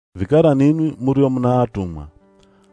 Vikara ninwi murio muna atumwa,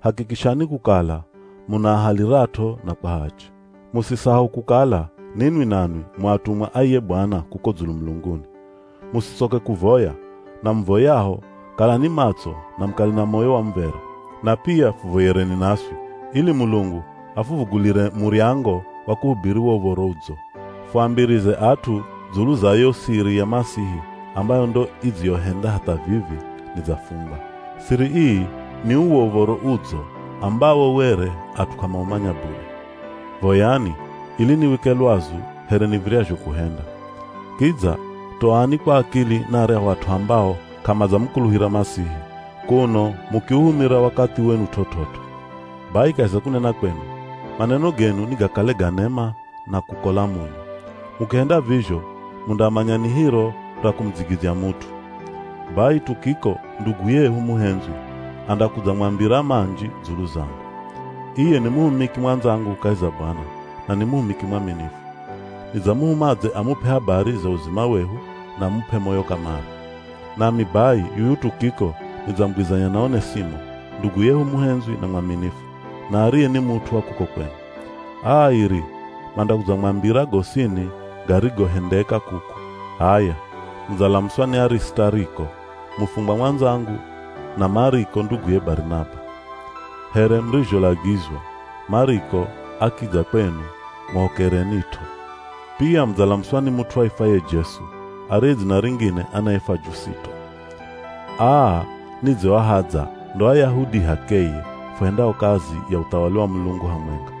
hakikishani kukala munaahalirat'o na kwa hachi. Musisahau kukala ninwi nanwi mu atumwa a iye Bwana kuko dzulu mulunguni. Musitsoke kuvoya, na muvoyaho kalani matso na mukale na moyo wa muv̱era. Na pia fuvoyereni naswi ili Mulungu afuvugulire muryango wa kuhubiri wo Uv̱oro Udzo. Fuambirize at'u dzulu za yo siri ya Masihi ambayo ndo idziyohenda hatha vivi nidzafungwa. Siri ii ni uwo Uv̱oro Udzo ambawo were at'u k'amaumanya bule. Voyani, ili niwike lwazu here niv̱iryazho kuhenda. Kidza toani kwa akili na aryahu at'u ambao k'amadzamukuluhira Masihi, kuno mukiuhumira wakathi wenu t'ot'ot'o. Bai kahi za kunena kwenu, maneno genu nigakale ga nema na kukola munyu. Mukihenda vizho mundamanya ni hiro ra kumudzigidzya mut'u. Bai Tukiko, ndugu yehu muhendzwi andakudzamwambira manji dzulu zangu. Iye ni muhumiki mwandzangu kahi za Bwana, na ni muhumiki mwaminifu. Nidzamuhuma adze amup'e habari za uzima wehu na amup'e moyo kamare. Nami bai yuyu Tukiko nidzamugwizanya na Onesimo, ndugu yehu muhendzwi na mwaminifu, na ariye ni mut'u wa kuko kwenu. Aa airi mandakudzamwambira gosini garigohendeka kuku. H'aya, mudzalamuswa ni Arisitariko, mufungwa mwandzangu na Mariko nduguye Barinaba. Here murizholagizwa, Mariko akidza kwenu, muhokerenit'o. Pia mudzalamuswa ni mut'u aifwaye Jesu, ariye dzina ringine anaifwa Jusito. Aa nidzioahadza ndo Ayahudi h'akeye fuhendao kazi ya uthawali wa Mulungu hamwenga.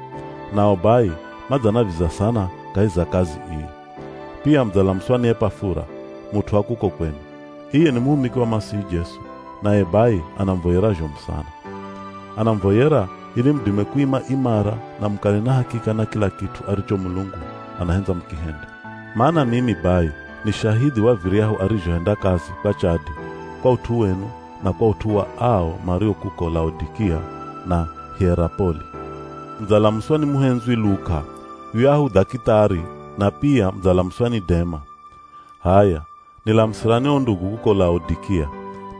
Nao bai madzanaviza sana kahi za kazi ii. Pia mudzalamuswa ni Epafura, mut'u wa kuko kwenu. Iye ni muhumiki wa Masihi Jesu, naye bai anamuvoyera zhomu sana. Anamuvoyera ili mudime kuima imara na mukale na hakika na kila kit'u aricho Mulungu anahendza mukihende. Mana mimi bai ni shahidhi wa viryahu arizhohenda kazi kwa chadi kwa ut'u wenu na kwa ut'u wa ao mario kuko Laodikia na Hierapoli. Mudzalamuswa ni muhendzwi Luka, yuyahu dhakitari, na pia mudzalamuswa ni Dema. H'aya, nilamusirani o ndugu kuko Laodikia.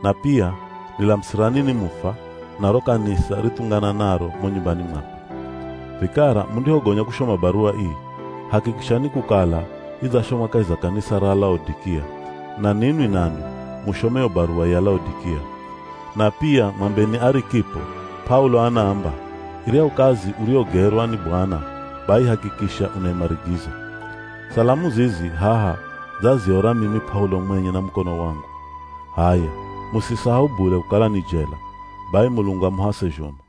Na pia nilamusirani Nimufa na ro kanisa rithungananaro mo nyumbani mwakwe. Vikara mundihogonya kushoma baruwa ii, hakikishani kukala idzashomwa kahi za kanisa ra Laodikia, na ninwi nanwi mushome yo baruwa ya Laodikia. Na pia mwambeni Arikipo, P'aulo anaamba, “Iryahu kazi uriyogerwa ni Bwana, bai hakikisha unaimarigiza.” Salamu zizi haha dzaziora mimi P'aulo mwenye na mukono wangu. H'aya, musisahau bule kukala ni jela. Bai Mulungu amuhase zhomu.